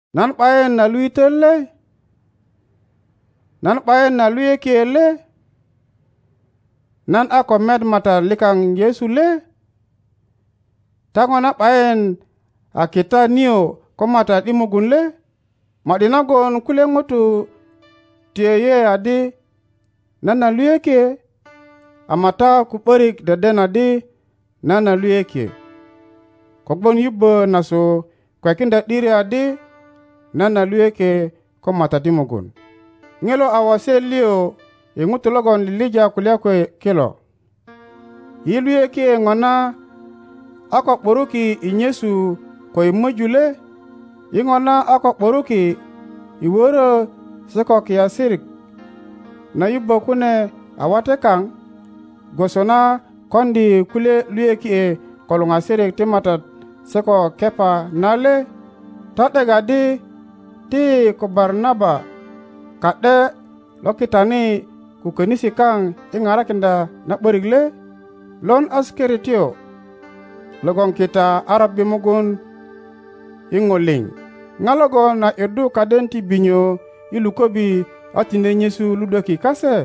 Nan ’bayin a luitöt le? Nan ’bayina luyökie le? Nan a ko met Matat likaŋ Yesu le? Ta ŋona ’bayin a kita nio ko Matat i mugun le? Ma ’di nagon kulye ŋutu ti yeye adi nan a luyökie, ama ta ko ’börik deden adi nan a luyökie, kogwon yubbö nasu kwekiŋdya ’diri adi nan a luyökie ko Matat i mugun. Ŋilo a waset liö i ŋutu logon lilija kulya kwe kilo. Yi luyökie ŋona a ko ’buruki i nyesu ko i möju le? Yi ŋona a ko ’buruki i wörö se ko kiasirik na yubbö kune a wate kaŋ, gwoso na koŋdi kulye luyökie ko luŋasirik ti Matat se ko Kepa na le? Ta ’dek adi ti yi ko Barnaba ka ’de lo kitani ko könisi kaŋ i parakiŋdya na ’börik le? Lon asekertyo logon kita a robbi mugun i ŋo liŋ? Da logon a ’yuddu kaden ti binyo i luköbi a tine nyesu ludweki kase?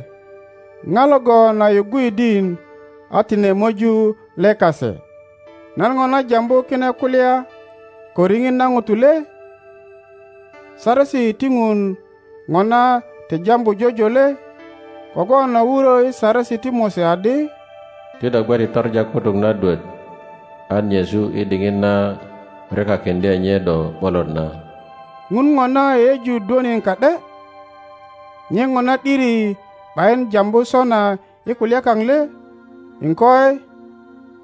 Da logon a yuggu yidin, a tine möju le kase? Nan ŋona jambu kine kulya ko riŋit na ŋuto le? Saresi ti Ŋun ŋona ti jambu jojo le? Tim 5.18Kogwon a wurö i Saresi ti Mose adi, Ti do gwe ti toŋa kutuk na dwöt an nyesu i diŋit na ryokakiŋdye nye do ’bolot na. Ŋun ŋona yeyeju dwönin ka ’de? Nye ŋona ’diri ’bayin jambu sona i kulya kaŋ le? Iŋkoi,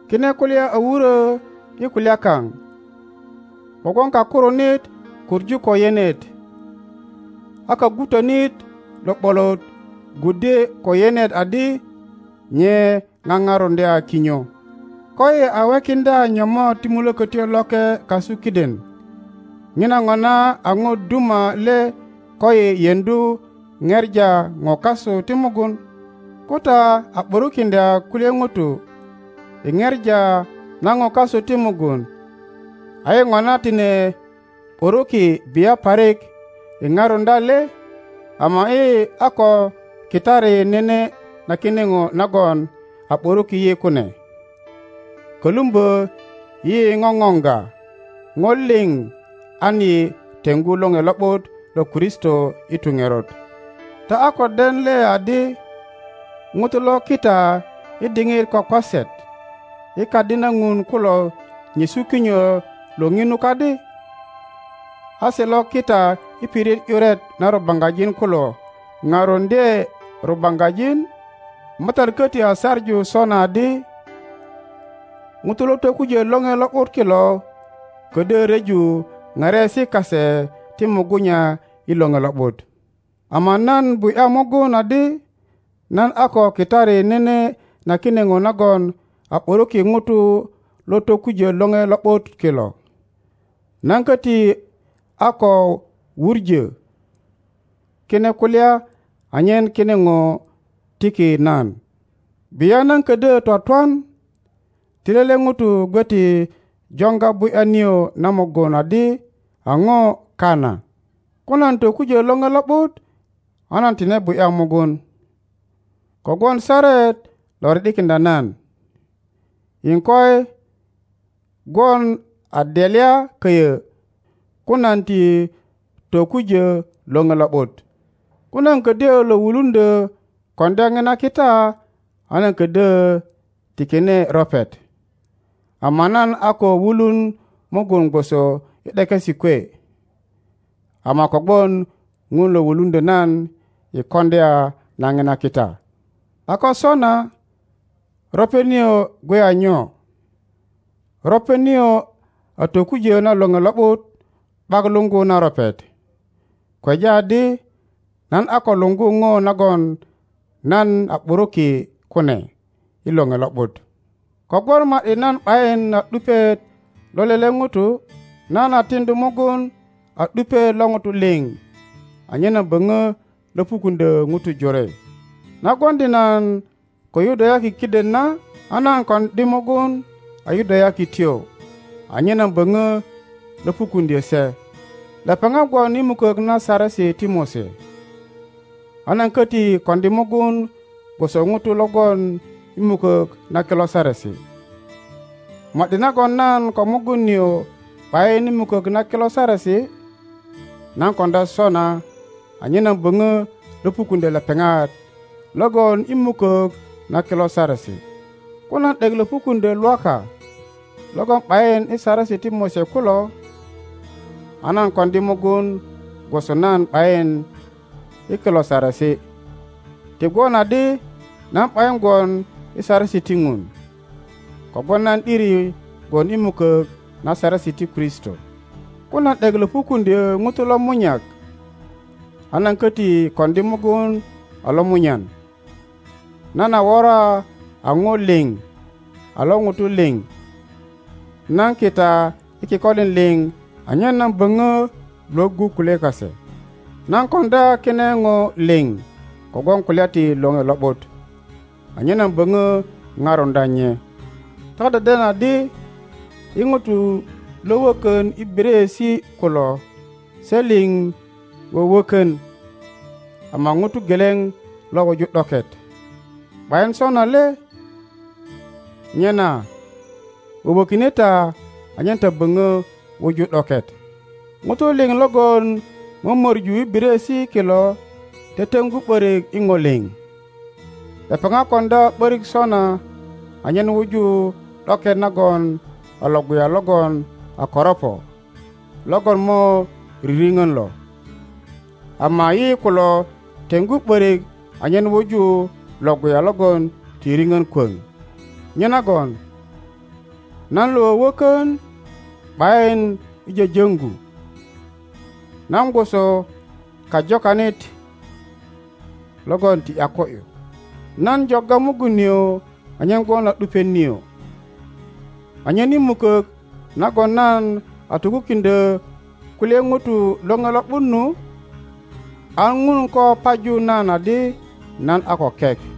kine kulya a wurö i kulya kaŋ, kogwon kakurunit kuŋu ko yenet, a kagwutönit lo ’bolot gwuddye ko yenet adi nye paparuŋdya kinyo. Koyi a wekiŋdya nyomot ti Mulökötyo Loke kasu kiden, ŋina ŋona a ŋo duma le koyi yeŋdu ŋepa ŋo kasu ti mugun? Ko ta a ’burukiŋdya kulye ŋutu i ŋepa na ŋo kasu ti mugun, a yi ŋona tine ’buruki bia parik i parundya le? Ama yi a ko kitari nene na kine ŋo nagon a ’buruki yi kune, kölumbö yi ŋoŋoŋga ŋo liŋ an yi teŋgu Loŋe Lo ’but lo Kristo i tu ŋerot. Ta a ko den le adi ŋutu lo kita i diŋit kwakwaset i Kadi na Ŋun kulo nyesu kinyo lo ŋinu kadi, a se lo kita i pirit ’yuret na rubaŋgajin kulo paruŋdye rubaŋgajin? Matat köti a saŋu sona adi, ŋutu lo tokujö Loŋe Lo ’but kilo ködyö ryeju pariesi kase ti mugunya i Loŋe Lo ’but. Ama nan bu ’ya mugun adi nan a ko kitari nene na kine ŋo nagon a ’buruki ŋutu lo tokujö Loŋe Lo ’but kilo. Nan köti a ko wuŋö kine kulya anyen kine ŋo tiki nan. Bia nan ködyö twatwan! Ti lele ŋuto gwe ti joŋga bu ’ya nio na mugun adi a ŋo kana. Ko nan tokujö Loŋe Lo ’but a nan tine bu ’ya mugun, kogwon saret lo ri ’dikiŋdya nan. Iŋkoi, gwon a delya köyö ko nan ti tokujö Loŋe Lo ’but! Ko nan ködyö lo wuluŋdyö koŋdya ŋina kita a nan kodyö tikine ropet, ama nan a ko wulun mugun gwoso i ’dekesi kwe, ama kogwon Ŋun lo wuluŋdyö nan i koŋdya na ŋina kita. A ko sona, ropet nio gwe a nyo? Ropet nio a tokujö na Loŋe Lo ’but ’bak luŋgu na ropet, kweja adi nan a ko luŋgu ŋo nagon nan a ’buruki kune i Loŋe Lo ’but. Kogwon ma ’di nan ’bayin a ’dupiet lo lele ŋuto, nan a tiŋdu mugun a ’dupiet lo ŋutu liŋ anyen nan böŋö löpukuŋdyö ŋutu jore. Na gwoŋdi nan ko Yudayaki kiden na, a nan koŋdi mugun a Yudayakityo anyen nan böŋö löpukuŋdyö se. Lepeŋat gwon i mukök na Saresi ti Mose, a nan köti koŋdi mugun gwoso ŋuto lo gwon i mukök na kilo Saresi; ma ’di nagon nan ko mugun nio ’bayin i mukök na kilo Saresi. Nan koŋdya ’sona anyen nan boŋo löpukuŋdyö lepeŋat lo gwon i mukok na kilo Saresi. Ko nan ’dek löpukuŋdyö lwaka logon ’bayin i Saresi ti Mose kulo, a nan koŋdi mugun gwoso nan ’bayin i kilo Saresi, ti gwon adi nan ’bayin gwon i saresi ti Ŋun, kogwon nan ’diri gwon i mukök na saresi ti Kristo. Ko nan ’dek löpukuŋdyö ŋuto lomunyak, a nan köti koŋdi mugun a lomunyan. Nan a wora a po liŋ a lo ŋuto liŋ; nan kita i kikolin liŋ anyen nan böŋö lwöggu kulye kase. Nan koŋdya kine ŋo liŋ kogwon kulya ti Loŋe Lo ’but, anyen nan böŋö paruŋdya nye. Ta deden adi i ŋuto lo wökön i biryeesi kulo se liŋ wöwökön, ama ŋuro geleŋ lo wuju ’doket, ’bayin sona le? Nyena wöwökine ta anyen ta böŋö wuju ’doket. ŋuto liŋ logon mömöŋu i biryeesi kilo teteŋgu ’börik i ŋo liŋ.Lepeŋat koŋdya ’börik sona anyen wuju ’doket nagon a Iŋguya logon a koroŋo logon mo riripön lo, ama yi kulo teŋgu ’börik anyen wuju Iŋguya logon ti ripön kwoŋ. Nyenagon nan lo wöwökön ’bayin i jöjöŋgu. Nan gwoso kajokanit logon ti ’yako ’yu; nan jogga mugun nio anyen gwon a ’dupiet nio, anyen i mukök nagon nan a tokukiŋdyö kulye ŋuto Loŋe Lo ’but nu, an Ŋun ko paju nan adi nan a ko kek.